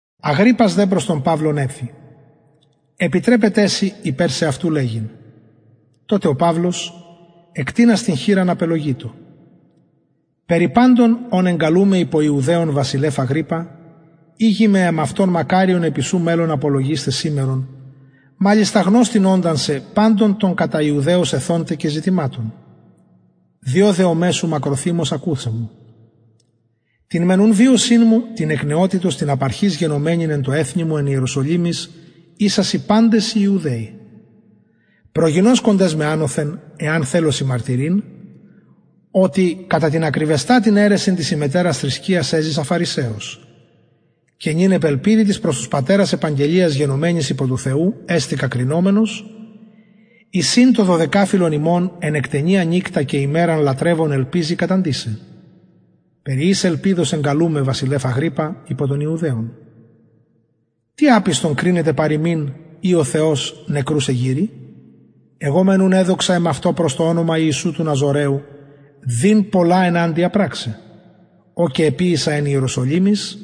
αγριππας δε προς τον παυλον εφη επιτρεπεται σοι υπερ σεαυτου λεγειν τοτε ο παυλος απελογειτο εκτεινας την χειρα περι παντων ων εγκαλουμαι υπο ιουδαιων βασιλευ αγριππα ηγημαι εμαυτον μακαριον επι σου μελλων απολογεισθαι σημερον μαλιστα γνωστην οντα σε παντων των κατα ιουδαιους ηθων τε και ζητηματων διο δεομαι σου μακροθυμως ακουσαι μου την μεν ουν βιωσιν μου την εκ νεοτητος την απ αρχης γενομενην εν τω εθνει μου εν ιεροσολυμοις ισασιν παντες οι ιουδαιοι προγινωσκοντες με ανωθεν εαν θελωσιν μαρτυρειν οτι κατα την ακριβεστατην αιρεσιν της ημετερας θρησκειας εζησα φαρισαιος και νυν επ ελπιδι της προς τους πατερας επαγγελιας γενομενης υπο του θεου εστηκα κρινομενος εις ην το δωδεκαφυλον ημων εν εκτενεια νυκτα και ημεραν λατρευον ελπιζει καταντησαι περι ης ελπιδος εγκαλουμαι βασιλευ αγριππα υπο ιουδαιων τι απιστον κρινεται παρ υμιν ει ο θεος νεκρους εγειρει εγω μεν ουν εδοξα εμαυτω προς το ονομα ιησου του ναζωραιου δειν πολλα εναντια πραξαι ο και εποιησα εν ιεροσολυμοις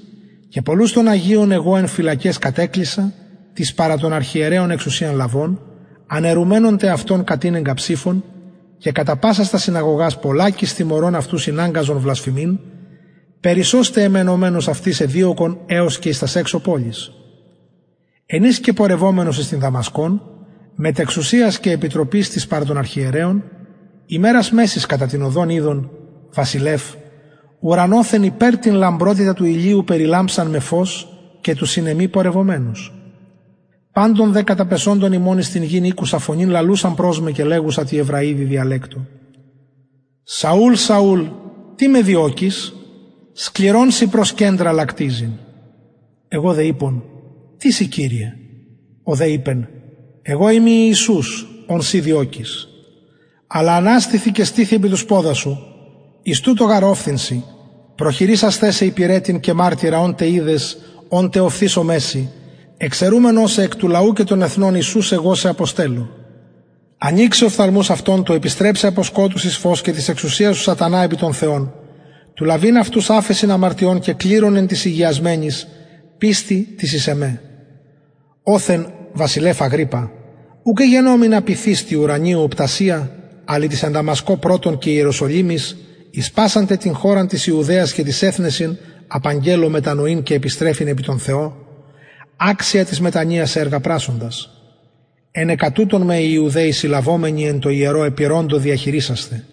και πολλους των αγιων εγω φυλακαις κατεκλεισα την παρα των αρχιερεων εξουσιαν λαβων αναιρουμενων τε αυτων κατηνεγκα ψηφον και κατα πασας τας συναγωγας πολλακις τιμωρων αυτους ηναγκαζον βλασφημειν περισσως τε εμμαινομενος αυτοις εδιωκον εως και εις τας εξω πολεις εν οις και πορευομενος εις την δαμασκον μετ εξουσιας και επιτροπης της παρα των αρχιερεων ημερας μεσης κατα την οδον ειδον βασιλευ ουρανοθεν υπερ την λαμπροτητα του ηλιου περιλαμψαν με φως και τους συν εμοι πορευομενους παντων δε καταπεσοντων ημων εις την γην ηκουσα φωνην λαλουσαν προς με και λεγουσαν τη εβραιδι διαλεκτω σαουλ σαουλ τι με διωκεις σκληρον σοι προς κεντρα λακτιζειν εγω δε ειπον τις ει κυριε ο δε ειπεν εγω ειμι ιησους ον συ διωκεις αλλα αναστηθι και στηθι επι τους ποδας σου εις τουτο γαρ ωφθην σοι προχειρισασθαι σε υπηρετην και μαρτυρα ων τε ειδες ων τε οφθησομαι σοι εξαιρουμενος σε εκ του λαου και των εθνων εις ους εγω σε αποστελλω ανοιξαι οφθαλμους αυτων του υποστρεψαι απο σκοτους εις φως και της εξουσιας του σατανα επι τον θεον του λαβειν αυτους αφεσιν αμαρτιων και κληρον εν τοις ηγιασμενοις πιστει τη εις εμε οθεν βασιλευ αγριππα ουκ εγενομην απειθης τη ουρανιω οπτασια αλλα τοις εν δαμασκω πρωτον και ιεροσολυμοις εις πασαν τε την χωραν της ιουδαιας και τοις εθνεσιν απαγγελλων μετανοειν και επιστρεφειν επι τον θεον αξια της μετανοιας εργα πρασσοντας ενεκα τουτων οι ιουδαιοι με συλλαβομενοι εν τω ιερω επειρωντο διαχειρισασθαι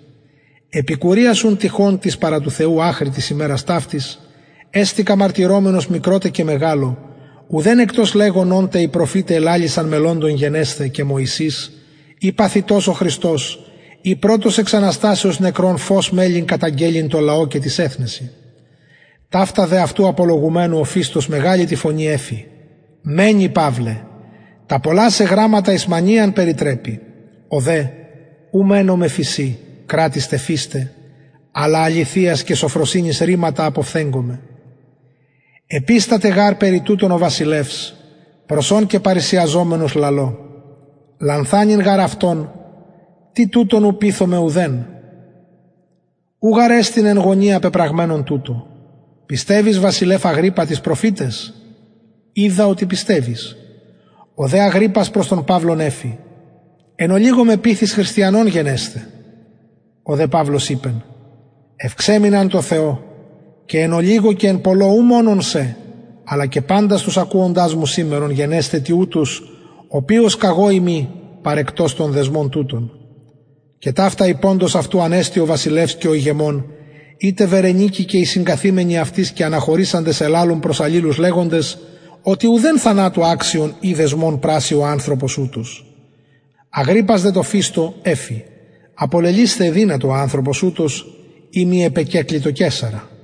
επικουριας ουν τυχων της παρα του θεου αχρι της ημερας ταυτης εστηκα μαρτυρομενος μικρω τε και μεγαλω ουδεν εκτος λεγων ων τε οι προφηται ελαλησαν μελλοντων γινεσθαι και μωυσης ει παθητος ο χριστος ει πρωτος εξ αναστασεως νεκρων φως μελλει καταγγελλειν τω λαω και τοις εθνεσιν ταυτα δε αυτου απολογουμενου ο φηστος μεγαλη τη φωνη εφη μαινη παυλε τα πολλα σε γραμματα εις μανιαν περιτρεπει ο δε ου μαινομαι φησιν κρατιστε φηστε αλλα αληθειας και σωφροσυνης ρηματα αποφθεγγομαι επισταται γαρ περι τουτων ο βασιλευς προς ον και παρρησιαζομενος λαλω λανθανειν γαρ αυτον τι τουτων ου πειθομαι ουδεν ου γαρ εν γωνια πεπραγμενον τουτο πιστευεις βασιλευ αγριππα τοις προφηταις οιδα οτι πιστευεις ο δε αγριππας προς τον παυλον εφη εν ολιγω με πειθεις χριστιανον γενεσθαι ο δε παυλος ειπεν ευξαιμην αν τω θεω και εν ολιγω και εν πολλω ου μονον σε αλλα και παντας τους ακουοντας μου σημερον γενεσθαι τοιουτους οποιος καγω ειμι παρεκτος των δεσμων τουτων και ταυτα ειποντος αυτου ανεστη ο βασιλευς και ο ηγεμων η τε βερνικη και οι συγκαθημενοι αυτοις και αναχωρησαντες ελαλουν προς αλληλους λεγοντες οτι ουδεν θανατου αξιον η δεσμων πρασσει ο ανθρωπος ουτος αγριππας δε τω φηστω εφη απολελυσθαι εδυνατο ο ανθρωπος ουτος ει μη επεκεκλητο καισαρα